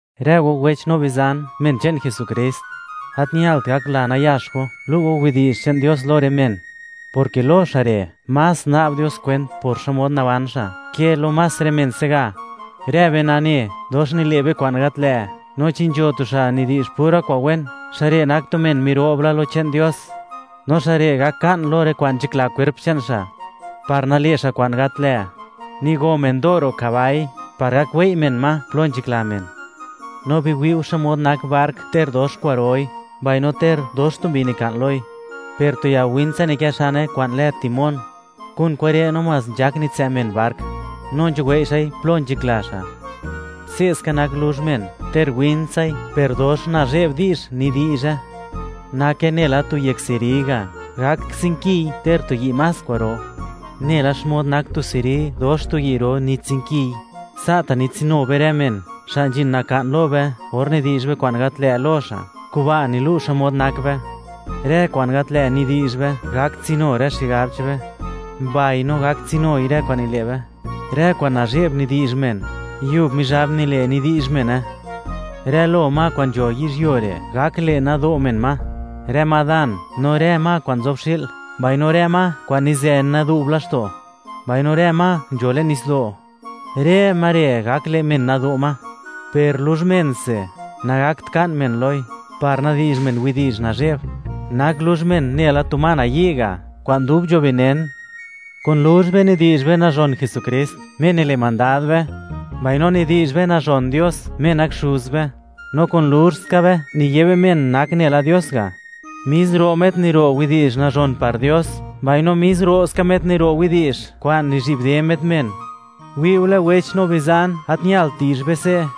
Rë go wech no bizan, men che'n Jesukrist, gat ñalt gakla nayax go, lu' go widi'zh che'n Dios lo rë men, porke lo xa' re' más na'b Dios kwent por xmod naban xa', ke lo más rë men se'ga. Rë be nane, dox nile' be kwa'n gat lë', no chi nzho tu xa' nidi'zh pura kwa'n wen, xa' re' nak tu men miro'b la lo che'n Dios, no xa' re' gak ka'n lo rë kwa'n nzhakla kwerp che'n xa' par nale' xa' kwa'n gat lë'. Nigo men do' ro' kabai par gak wei' men ma plo nzhakla men. No biwi' go xmod nak bark, ter dox kwa'roi, mbaino ter dox tu mbi nika'n loi, per tu ya win tsa nikë xane kwa'n lë timón; kun kure' namás nzhak nitsë' men bark, no nzhuwei' xa'i plo nzhakla xa'. Se'ska nak luzh men: ter wintsai, per dox nazhe'b di'zh nidi'zhe; nake nela tu yek seri ga', gak tsinkiy ter tu yi' más kwa'ro. Nela xmod nak tu seri dox tu yi' ro nitsinkiy, sa'ta' nitsinu be rë men xa' nzhin naka'n lo be or nidi'zh be kwa'n gat lë' lo xa'; kuba' nilu' xmod nak be. Rë kwa'n gat lë' nidi'zh be gak tsinu rë xigab che'n be, mbaino gak tsinui rë kwa'n nile' be. Rë kwa'n nazhe'b nidi'zh men, Yub Mizhab nile' nidi'zh mene. Rë lo ma kwa'n nzho yizhyuo re', gak le' nado' men ma, rë ma dan, no rë ma kwa'n nzob xi'l, mbaino rë ma kwa'n nizë nadu'b laxto', mbaino rë ma nzho le'n nitsdo'; rë ma re' gak le' men nado' ma. Per luzh mense, nagakt ka'n men loi par nadi'zh men widi'zh nazhe'b. Nak luzh men nela tu ma nayi' ga', kwa'n dub nzho benen. Kun luzh be nidi'zh be nazhon Jesukrist, Me nile' mandad be, mbaino nidi'zh be nazhon Dios, Me nak Xuz be; no kun luzh ska be, niye be men nak nela Dios ga'. Mis ro' met niro' widi'zh nazhon par Dios, mbaino mis ro' ska met niro' widi'zh kwa'n nizhi'bde met men. Wi'ule wech no bizan, gat ñalt di'zh be se'.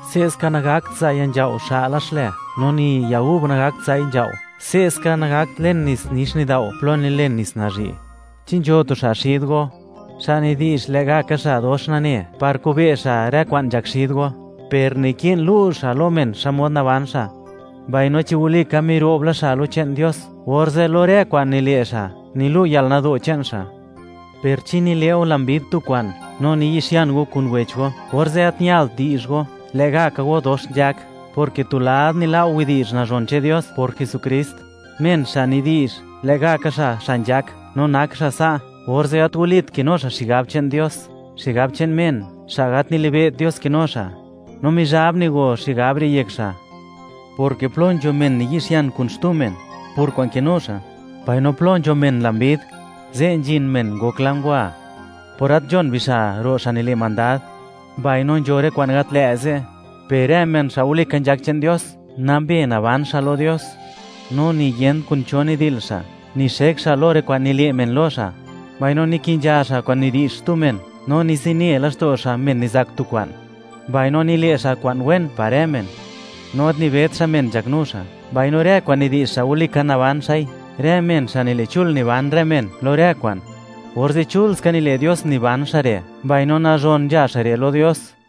Se'ska, nagakt za' ya nzhao' xa'la xlë, no ni ya gub gakt za'i nzhao'. Se'ska nagakt len nits nix nidao' plo nilen nits nazhi'. ¿Chi nzho tu xa' xid go, xa' nidi'zh lë'gaka xa' dox nane par kobe' xa' (wi' xa') rë kwa'n nzhak xid go? Per naki'n lu' xa' lo men xmod naban xa', mbaino chi walika miro'b la xa' lo che'n Dios, orze' lo rë kwa'n nile' xa' nilu' yalnado' che'n xa'. Per chi nile' go lambid tu kwa'n no niyi'xian go kun wech go, orze' gat ñalt di'zh go, lë'gaka go dox nzhak, porke tu lad nila' go widi'zh nazhon che'n Dios por Jesukrist. Men xa' nidi'zh, lë'gaka xa', xa' nzhak no nak xa' sa', orze' gat walit kinu xa' xigab che'n Dios; xigab che'n men, xa' gat nilibe't Dios kinu xa', no Mizhab nigo xigab re' yek xa', porke plo nzho men niyi'xian kun xtu men por kwa'n kinu xa', mbaino plo nzho men lambid, ze' nzhin men ngokla ngwa por gat nzhon bixa' ro' xa' nile' mandad, mbaino nzho rë kwa'n gat lë' ze'. Per rë men xa' walika nzhak che'n Dios, nambe naban xa' lo Dios, no niyent kun cho nidil xa', nixek xa' lo rë kwa'n nile' men lo xa', mbaino niki'nzha xa' kwa'n nidi'zh xtu men, no nizine laxto' xa' men nizak tu kwa'n, mbaino nile' xa' kwa'n wen par rë men, no gat nibet xa' men nzhaknu xa', mbaino rë kwa'n nidi'zh xa' walika naban xa'i. Rë men xa' nile' chul niban rë men lo rë kwa'n, orze' chul ska nile' Dios niban xa' re', mbaino nazhon nzha xa' re' lo Dios.